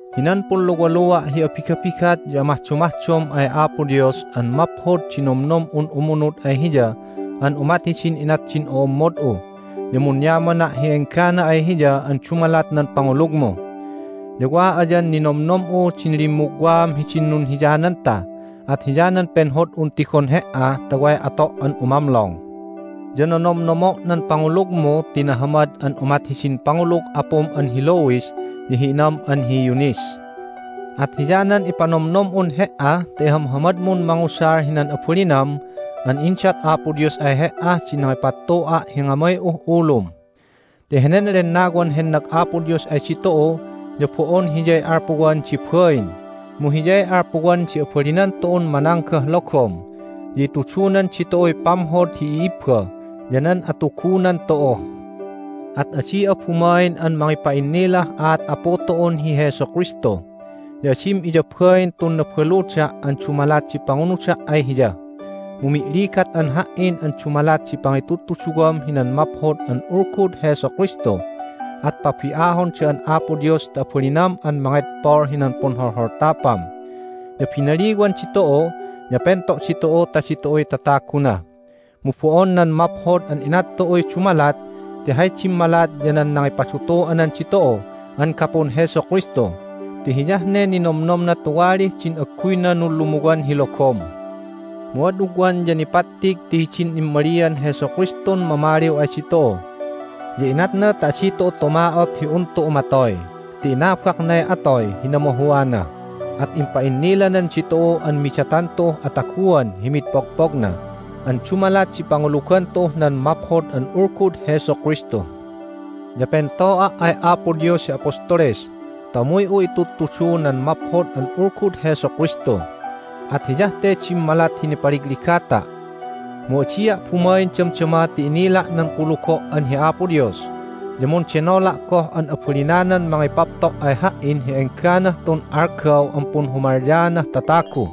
Hinan punluwalua' hi abigabigat ya amahdomahdom ay Apo Dios an maphod di nomnom'un umunud ay Hiya an umat hidin inat din o'ommod'u ya munyamana' hi enggana ay Hiya an dumalat nan pangulugmu. Ya wa ayan ninomnom'u din limmugwaam hidin nunhiyananta at hiyanan penhod'un tigon he"a ta way ato' an umamlong. Ya nonomnomo' nan pangulugmu ti nahamad an umat hidin pangulug apum an hi Lois ya hi inam an hi Eunice. At hiyanan ipanomnom'un he"a ta ihamhamadmun mangusal hinan abalinam an indat Apo Dios ay he"ah din nangipattu'a' hi ngamay'uh ulum. Ti henen Lennawan hennag Apo Dios ay ditu'u ya bo'on Hiyay alpuwan di bain mu Hiyay alpuwan di abalinan tu'un mananggah logom, ya itudunan ditu'uy pamhod hi i'ibba ya nan atugunan tu'u. At adi'a bumain an mangipa'innilah aat Apu tu'un hi Jesu Kristu, ya adim iyabain tun nabaluda' an dumalat di pangunuda' ay Hiya, mu mi'ligat'an ha"in an dumalat di pangitudtuduwam hinan Maphod an Ulgud Jesu Kristu, at pabi'ahon da'an Apo Dios ta abalinam an mangedpol hinan punholholtapam. Ya binaliwan ditu'u, ya pento' ditu'u ta ditu'uy tataguna. Mu bo'on nan maphod an inat tu'uy dumalat ti hay dimmalat ya nan nangipadutu'anan ditu'u an gapun Jesu Kristu ti hiyah ne ninomnomna tuwalih din agguyna nunlumuwan hi logom. Mu ad ugwan ya nipattig ti hidin immalian Jesu Kristun mamaliw ay ditu'u. Ya inatna ta adi tu'u tuma'ot hi un tu'u matoy ti inabaknay atoy hi namahuana, at impa'innilanan ditu'u an midatan tu'uh ataguan hi mid pogpogna an dumalat di pangulugan tu'uh nan Maphod an Ulgud Jesu Kristu. Ya pento'a' ay Apo Dios hi apostoles ta umuy'u itudtudu nan Maphod an Ulgud Jesu Kristu, at hiyah te dimmalat hi nipaligligata'. Mu adia' bumain damdama ti inila' nan kulugo' an hi Apo Dios, ya mundenola' goh an abalinanan mangipapto' ay ha"in hi engganah tun algaw an punhumalyaanah tatagu.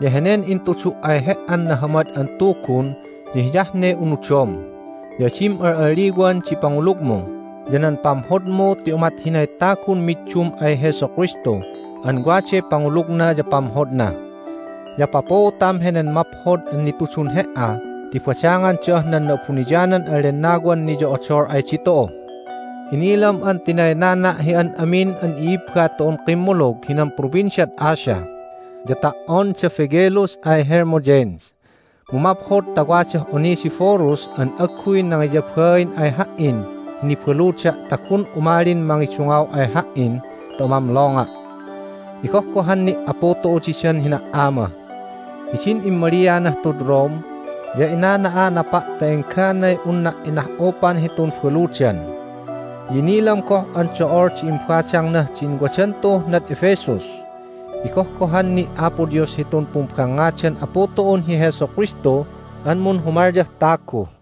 Ya henen intudu' ay he"an Nahamad an Tugun ya hiyah ne unudom. Ya adim al'alliwan di pangulugmu ya nan pamhodmu ti umat hinay tagun middum ay Jesu Kristu an waday pangulugna ya pamhodna. Ya papuutam henen maphod an nitudun he"a ti badangan da'ah nan Na'abuniyanan an Lennawan niyo'odol ay ditu'u. Inilam an tinaynana' hi an amin an i'ibba tu'un kimmulug hinan Provinciad Asia, ya ta"on da Phygelus ay Hermogenes. Mu maphod ta wadah Onesiphorus an agguy nangiyabain ay ha"in hi nibaluda' ta gun umalin mangidungaw ay ha"in ta umamlonga'. Igohgohan ni' Apu tu'u didan hina"ama. Hidin immalianah tud Rome ya inana'anapa' ta engganay unna' inah'upan hitun baludan. Ya inilam goh an do'ol di imbadangnah din wadan tu'uh nad Ephesus. Igohgohan ni' Apo Dios hitun pumbangngadan Apu tu'un hi Jesu Kristu an munhumalyah tagu.